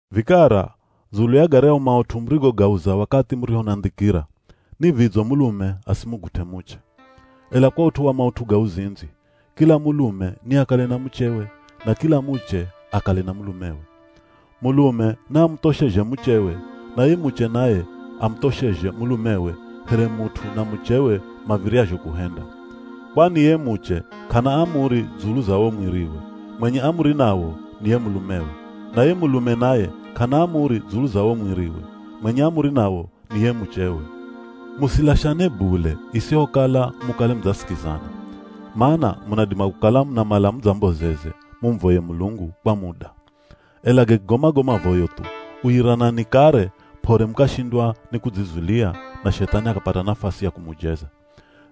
Vikara, dzulu ya garyahu maut'u murigogauza wakathi murihonandhikira, ni vidzo mulume asimugut'e muche. Ela kwa ut'u wa maut'u ga uzindzi, kila mulume niakale na muchewe, na kila muche akale na mulumewe. Mulume naamuthoshezhe muchewe, na ye muche naye amuthoshezhe mulumewe here mut'u na muchewe mav̱iryazho kuhenda. Kwani ye muche k'ana amuri dzulu za wo mwiriwe, mwenye amuri nawo ni ye mulumewe. Na ye mulume naye k'ana amuri dzulu za wo mwiriwe, mwenye amuri nawo ni ye muchewe. Musilashane bule isihokala mukale mudzasikizana. Mana munadima kukala munamala mudzambozeze mumuvoye Mulungu kwa muda. Ela gakigoma go mavoyo thu, uyiranani kare p'ore mukashindwa ni kudzizulia na Shethani akapata nafasi ya kumujeza.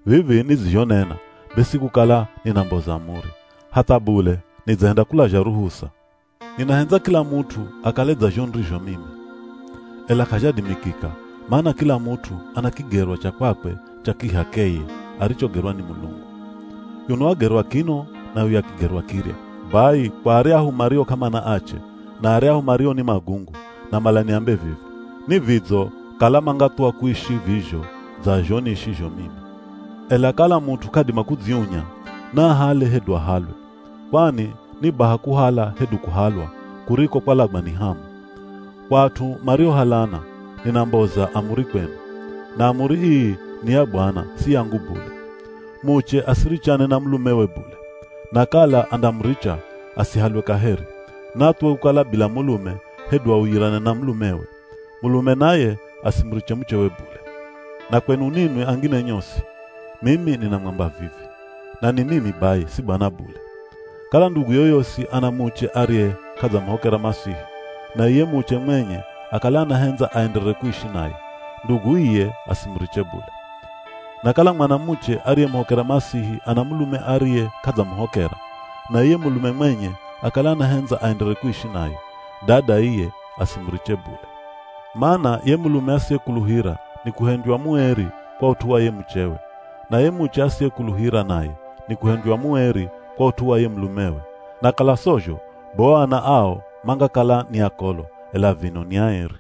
Vivi nidzizhonena be si kukala ninamboza amuri, hatha bule nidzahenda kulazha ruhusa. Ninahendza kila mut'u akale dza zho nirizho mimi. Ela k'azhadimikika, mana kila mut'u ana kigerwa cha kwakwe cha kih'akeye arichogerwa ni Mulungu. Yuno wagerwa kino na yuya akigerwa kirya. Bai kwa aryahu mario k'amana ache, na aryahu mario ni magungu, namala niambe vivi: Ni vidzo kala mangathuwa kuishi vizho dza zho niishizho mimi. Ela kala mut'u k'adima kudziunya, naahale hedu ahalwe. Kwani ni baha kuhala hedu kuhalwa kuriko kwalagwa ni hamu. Kwa at'u mariohalana, ninamboza amuri kwenu. Na amuri ii ni ya Bwana si yangu bule. Muche asirichane na mulumewe bule. Na kala andamuricha, asihalwe kaheri, naathuwe kukala bila mulume hedu auyirane na mulumewe. Mulume naye asimuriche muchewe bule. Na kwenu ninwi angine nyosi, mimi ninamwamba vivi, na ni mimi bai si Bwana bule. Kala ndugu yoyosi ana muche ariye k'adzamuhokera Masihi, na iye muche mwenye akale anahendza aenderere kuishi naye, ndugu iye asimuriche bule. Na kala mwanamuche ariyemuhokera Masihi ana mulume ariye k'adzamuhokera, na iye mulume mwenye akale anahendza aenderere kuishi naye, dada iye asimuriche bule. Mana ye mulume asiyekuluhira nikuhendywa mueri kwa ut'u wa ye muchewe. Na ye muche asiyekuluhira naye nikuhendywa mueri kwa ut'u wa ye mulumewe. Na kala sozho, be o ana ao mangakala ni akolo, ela vino ni aeri.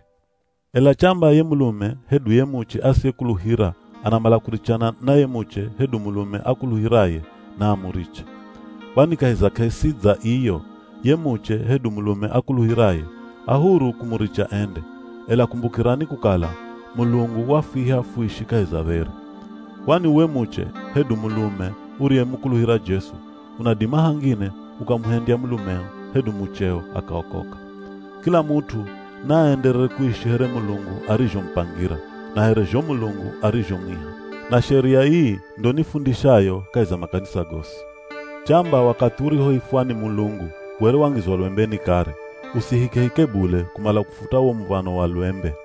Ela chamba ye mulume hedu ye muche asiyekuluhira anamala kurichana na ye muche hedu mulume akuluhiraye, naamuriche. Kwani kahi za k'esi dza iyo ye muche hedu mulume akuluhiraye a huru kumuricha ende, ela kumbukirani kukala Mulungu wafwiha fuishi kahi za dheri. Kwani uwe muche hedu mulume uriyemukuluhira Jesu, unadima hangine ukamuhendya mulumeo, hedu mucheo akaokoka. Kila mut'u naaenderere kuishi here Mulungu arizhomupangira, na here zho Mulungu arizhomwiha. Na sheria ii ndo nifundishayo kahi za makanisa gosi. Chamba wakathi urihoifwa ni Mulungu were wangizwa lwembeni kare, usihikehike bule kumala kufuta wo muv̱ano wa lwembe.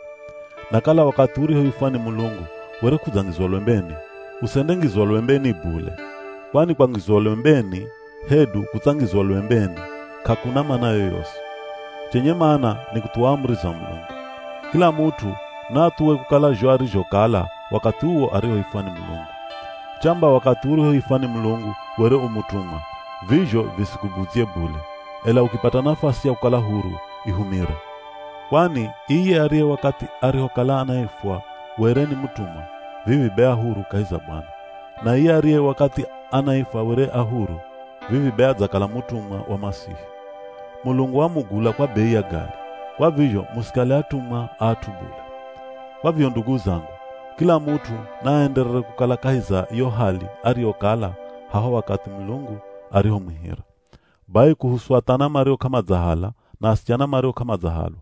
Na kala wakathi urihoifwa ni Mulungu were k'udzangizwa lwembeni, usendengizwa lwembeni bule. Kwani kwangizwa lwembeni, hedu kutsangizwa lwembeni k'akuna mana yoyosi. Chenye mana ni kuthuwa amuri za Mulungu. Kila mut'u naathuwe kukala zho arizhokala wakathi uwo arihoifwa ni Mulungu. Chamba wakathi urihoifwa were u mutumwa, vizho visikubudzye bule. Ela ukipata nafasi ya kukala huru, ihumire. Kwani iye ariye wakathi arihokala anaifwa were ni mutumwa, vivi be a huru kahi za Bwana. Na iye ariye wakathi anaifwa were a huru, vivi be adzakala mutumwa wa Masihi. Mulungu wamugula kwa bei ya gali, kwa vizho musikale atumwa a at'u bule. Kwa vizho ndugu zangu, kila mut'u naaenderere kukala kahi za yo hali ariyokala haho wakathi Mulungu arihomwihira. Bai kuhusu athana mario k'amadzahala na asichana mario k'amadzahalwa: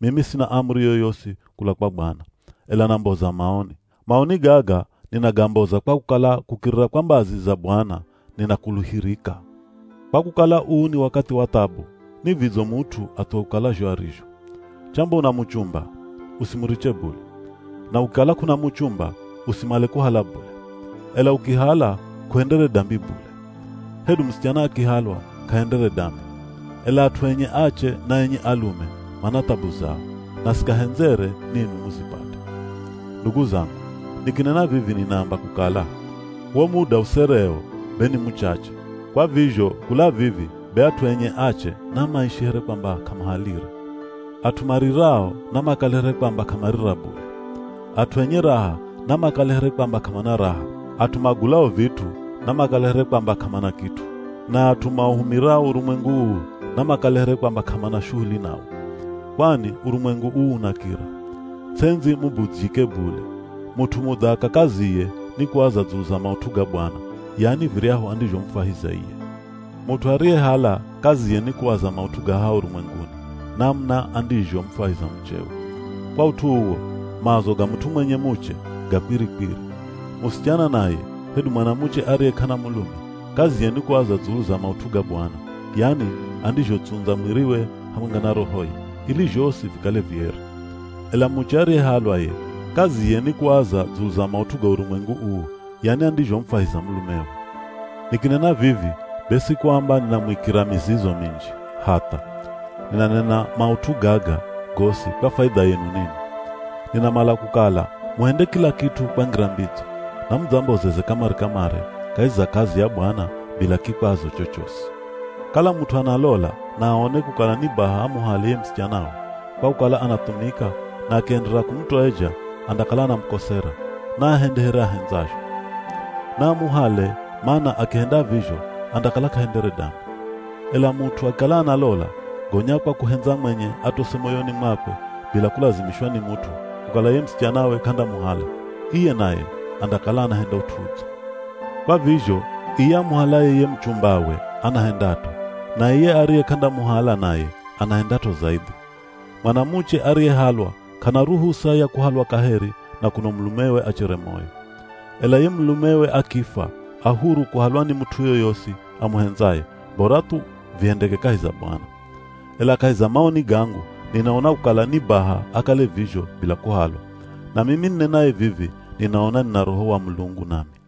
Mimi sina amuri yoyosi kula kwa Bwana, ela namboza maoni. Maoni gaga ninagamboza kwa kukala kukirira kwa mbazi za Bwana ninakuluhirika. Kwa kukala uu ni wakathi wa thabu, ni vidzo mut'u athuwe kukala zho arizho. Chamba una muchumba, usimuriche bule. Na ukikala k'una muchumba usimale kuhala bule. Ela ukihala, k'uhendere dambi bule. Hedu musichana akihalwa, k'ahendere dambi. Ela at'u enye ache na enye alume mana thabu zao, na sikahendzere ninwi muzipate. Ndugu zangu, nikinena vivi ninaamba kukala, wo muda usereo be ni muchache. Kwa vizho kula vivi be at'u enye ache namaishi here kwamba k'amahalire. At'u marirao namakale here kwamba k'amarira bule. At'u enye raha namakale here kwamba k'amana raha. At'u magulao vit'u namakale here kwamba k'amana kit'u. Na at'u mauhumirao urumwengu uu, namakale here kwamba k'amana shuhuli nawo. Kwani urumwengu uu unakira. Ts'endzi mubudzyike bule. Mut'u mudhaka kaziye ni kuaza dzulu za maut'u ga Bwana, yani viryahu andizhomufwahiza iye. Mut'u ariyehala kaziye ni kuaza maut'u ga haha urumwenguni, namuna andizhomufwahiza muchewe. Kwa ut'u uwo, maazo ga mut'u mwenye muche ga kwiri-kwiri. Musichana naye hedu mwanamuche ariye k'ana mulume, kaziye ni kuaza dzulu za maut'u ga Bwana, yani andizhotsundza mwiriwe hamwenga na rohoye, ili zhosi vikale vieri. Ela muche ariyehalwa ye kaziye ni kuaza dzulu za maut'u ga urumwengu uu, yani andizhomufwahiza mulumewe. Nikinena vivi be si kuamba ninamuikira mizizo minji, hatha. Ninanena maut'u gaga gosi kwa faidha yenu ninwi. Ninamala kukala muhende kila kit'u kwa ngira mbidzo, na mudzambozeze kamare-kamare kahi za kazi ya Bwana bila kikwazo chochosi. Kala mut'u analola na aone kukala ni baha amuhale ye musichanawe, kwa kukala anathumika na akienderera kumutoeja andakala anamukosera, naahende here ahendzazho. Naamuhale mana akihenda vizho andakala k'ahendere dambi. Ela mut'u akikala analola, gonya kwa kuhendza mwenye atose moyoni mwakwe bila kulazimishwa ni mut'u kukala ye musichanawe k'andamuhala, iye naye andakala anahenda ut'u udzo. Kwa vizho iye amuhalaye ye muchumbawe anahendat'o, na iye ariye k'andamuhala naye anahendat'o zaidhi. Mwanamuche ariyehalwa k'ana ruhusa ya kuhalwa kaheri na kuno mulumewe achere moyo. Ela ye mulumewe akifwa a huru kuhalwa ni mut'u yoyosi amuhendzaye bora thu vihendeke kahi za Bwana. Ela kahi za maoni gangu ninaona kukala ni baha akale vizho bila kuhalwa. Na mimi ninenaye vivi ninaona nina Roho wa Mulungu nami.